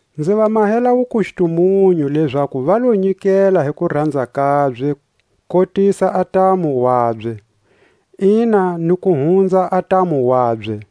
Nzi va mahela wukustumunyu lezaku va lo nyikela hi kuranza kabye kotisa a ntamu wabye, ina ni ku hunza a ntamu wabye.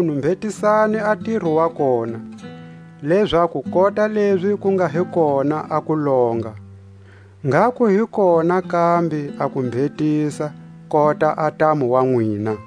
Makunu mbhetisani a ntiro wa kona, lezaku kota lezi ku nga hi kona a kulonga, ngha ku hi kona kambe a kumbhetisa kota a ntamu wa nwina.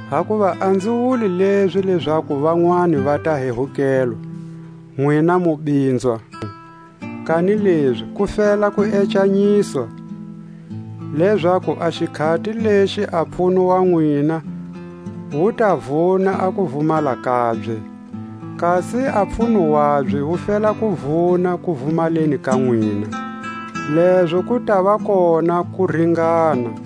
Hakuva a nzi wuli lezi lezaku vanwani va ta hehukelwa, nwina mu binzwa; kanilezi ku fela ku ecanyiswa; lezaku a xikhati lexi a pfuno wa nwina wu ta vuna a kuvumala kabye, kasi a pfuno wabye wu fela ku vuna kuvumaleni ka nwina, lezo ku tava kona kuringana;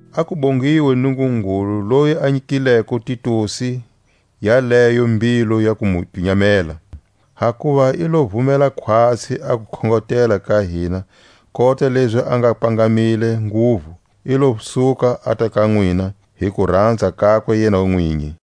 A ku bongiwe Nungungulu loyi a nyikileko Titusi yaleyo mbilu ya ku mu pinyamela. Hakuva i lo vumela khwatsi a kukhongotela ka hina kota lezi a nga pangamile nguvu i lo suka ata ka nwina hi kuranza kakwe yena nwinyi.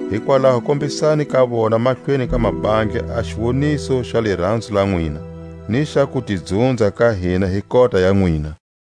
Hikwalaho kombisani ka vona mahlweni ka mabandla a xiwoniso xa liranzo la nwina, ni xa kutidzunza ka hina hi kota ya nwina.